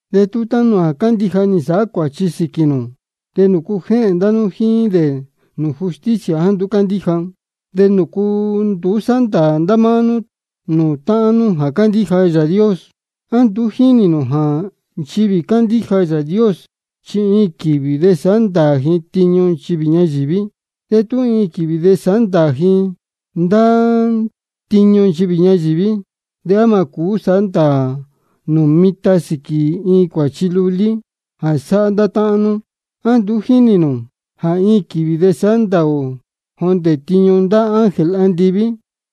De tú táhán nú jā cándíja nī nsāhá cuāchi sīquī nū, ¿de nūcu jéhēn ndá nú jíín dē nūū justicia jāá nduú cándíja? ¿De nūcu nduú sáhá ndāā ndá nú nūū táhán nú jā cándíja Yāā Dios? ¿A nduú jínī nū jā nchivī cándíja Yāā Dios chi iin quīvī de sāhá ndāā ji tiñu nchivī ñayīví? De tú iin quīvī sāhá ndāā ndá nú tiñu nchivī ñayīví, ¿de á mā cūú sāhá ndāā nū mitan sīquī iin cuāchi lulí jā sáhá ndá táhán nú? ¿A nduú jínī nū jā iin quīvī de sāhá ndāā ō jondē tiñu ndá ángel andiví?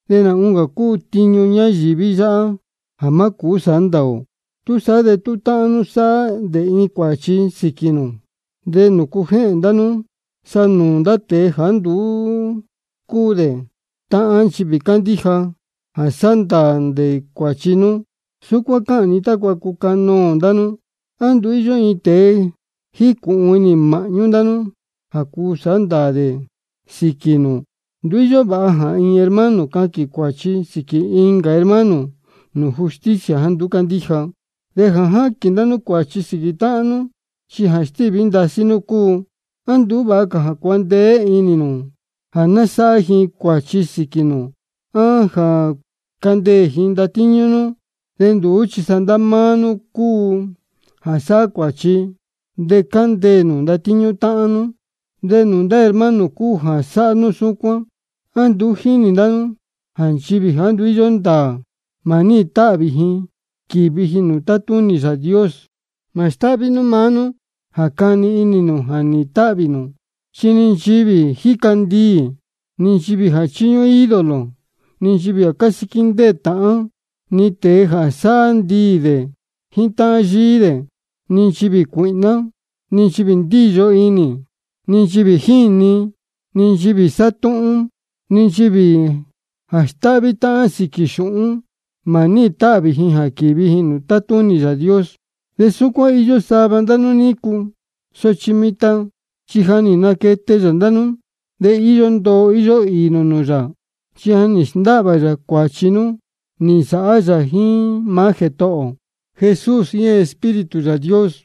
De nā oncā cúu tiñu ñayīví yáhá jā má cūú sāhá ndāā ō. Túsaá de tú táhán nú sáhá dē iin cuāchi sīquī nū, ¿de nūcu jéhēn ndá nú sa nūū ndá tēe jāá nduú cúu dē táhán nchivī cándíja jā sāhá ndāā dē cuāchi nú? Súcuán cáhān ni tácua cucanoō ndá nú. ¿A nduú íyó ni iin tēe jícūhun inī māhñú ndá nú jā cuu sāhá ndāā dē sīquī nū? Nduú íyó vāha jā iin hermano caquīn cuāchi sīquī incā hermano nūū justicia jāá nduú cándíja. De jā jáquīn ndá nú cuāchi sīquī táhán nú, chi jā stíví ndasí nú cúu. ¿A nduú vāha cā jā cuandeé inī nū jā ná sáhá ji cuāchi sīquī nū á jā candeē ji ndatíñú nú? De nduú chi sa ndá máá nú cúu jā sáhá cuāchi de cándeē nū ndatíñú táhán nú, de nūū ndá hermano cúu jā sáhá nú súcuán. ¿A nduú jínī ndá nú jā nchivī jāá nduú íyó ndāā, mā níhīn táhvī ji quīvi ji nūū tátúnī Yāā Dios? Mā stáhví nú maá nú jā cani inī nū jā nīhīn táhvī nū, chi ni nchivī jā jíca ndiī, ni nchivī jā chíñúhún ídolo, ni nchivī jā cásíquí ndéē táhán, ni tēe jā sáhá ndiī jíín táhán yíí, ni nchivī cuīhná, ni nchivī ndíyo inī, ni nchivī jíni, ni nchivī sátúhún, ni nchivī jā stáhví táhán sīquī xūhún, mā níhīn táhvī ji quīvi ji nūū tátúnī Yāā Dios. De súcuán nī īyo sava ndá nú nícu, sochi mitan chi ja nī naquete yā ndá nú, de íyó ndoo íyó īī nū nūū yā. Chi ja nī sndáhvā yā cuāchi nú nī nsāhá yā jíín maá Jētohō ō Jesús jíín Espíritu Yāā Dios.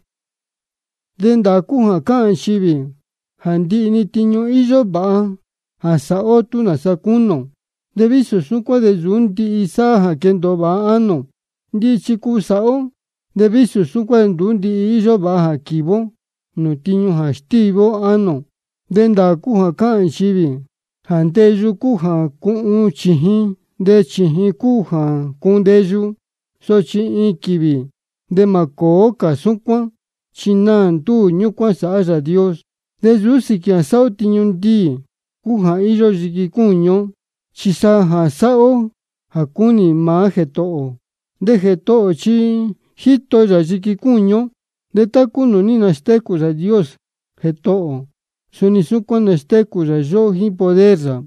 De ndāā cúu jā cáhān nchivī jā ndihi-ni tiñu íyó vāha jā sāhá ó tú nāsa cúnī ō. De vísō súcuán de nsūú ndihi sáhá jā quéndōo vāha ánō ō. Ndihi chi cuu sāhá ó, de vísō súcuán de nduú íyó vāha jā quívi ó nūū tiñu jā stíví ánō ō. De ndāā cúu jā cáhān nchivī jā ndeyu cúu jā cuhun chījin, de chījin cúu jā cuhun ndeyu. Sochi iin quīvī de mā cōó cā súcuán, chi naā ndúū ñúcuán sāhá Yāā Dios. De nsūú sīquī jā sāhá ó tiñu ndiī cúu jā íyó yiqui cúñu ó, chi sa jā sāhá ó jā cúnī maá Jētohō ō. De Jētohō ō chi jíto yā yiqui cúñu ó. De tá cúu nūū ní nastécū Yāā Dios Jētohō ō, suni súcuán nastécū yā yóhó jíín poder yā.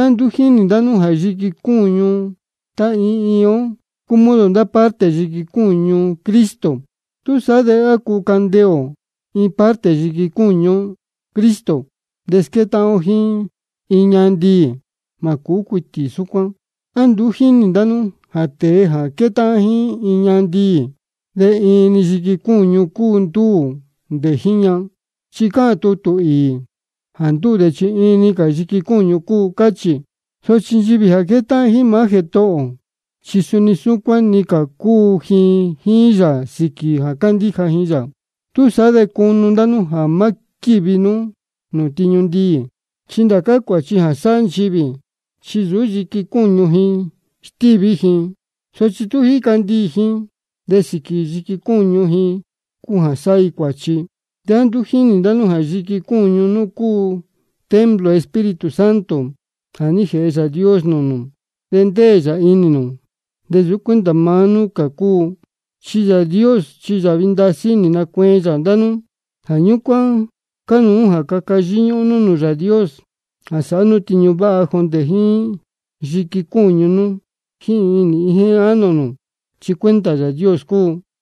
¿A nduú jínī ndá nú jā yiqui cúñu tá iin iin ó cúu modo ndá parte yiqui cúñu Cristo? ¿Túsaá de á cuu candeē ō iin parte yiqui cúñu Cristo de squétáhán ó jíín iin ñahan ndiī? Mā cūú cuitī súcuán. ¿A nduú jínī ndá nú jā tēe jā quétáhán jíín ñahan ndiī, de iin-ni cā yiqui cúñu nī nduu dē jíín ña? Chi cáhān tutū īī: Jā ndúū dē chi iin-ni cā yiqui cúñu cúu, cáchī. Sochi nchivī jā quétáhán jíín maá Jētohō ō, chi suni súcuán iin-ni cā cúu ji jíín yā sīquī jā cándíja ji yā. Túsaá de cunu ndá nú jā má quívi nú nūū tiñu ndiī. Chi ndá cā cuāchi jā sáhá nchivī, chi nsūú yiqui cúñu ji stíví ji. Sochi tú jíca ndiī ji, de sīquī yiqui cúñu ji cúu jā sáhá ji cuāchi. ¿A nduú jínī ndá nú jā yiqui cúñu nú cúu templo Espíritu Santo jā ní jēhe Yāā Dios nūū nū, de ndéē yā inī nū? De nsūú cuenta maá nú cúu nú. Chi Yāā Dios chi yāhvi ndasí nī nacueen yā ndá nú. Jā ñúcuán cánuú jā caca yíñúhún nú nūū Yāā Dios jā sāhá nú tiñu váha jondē jíín yiqui cúñu nú jíín inī jíín ánō nū, chi cuenta Yāā Dios cúu.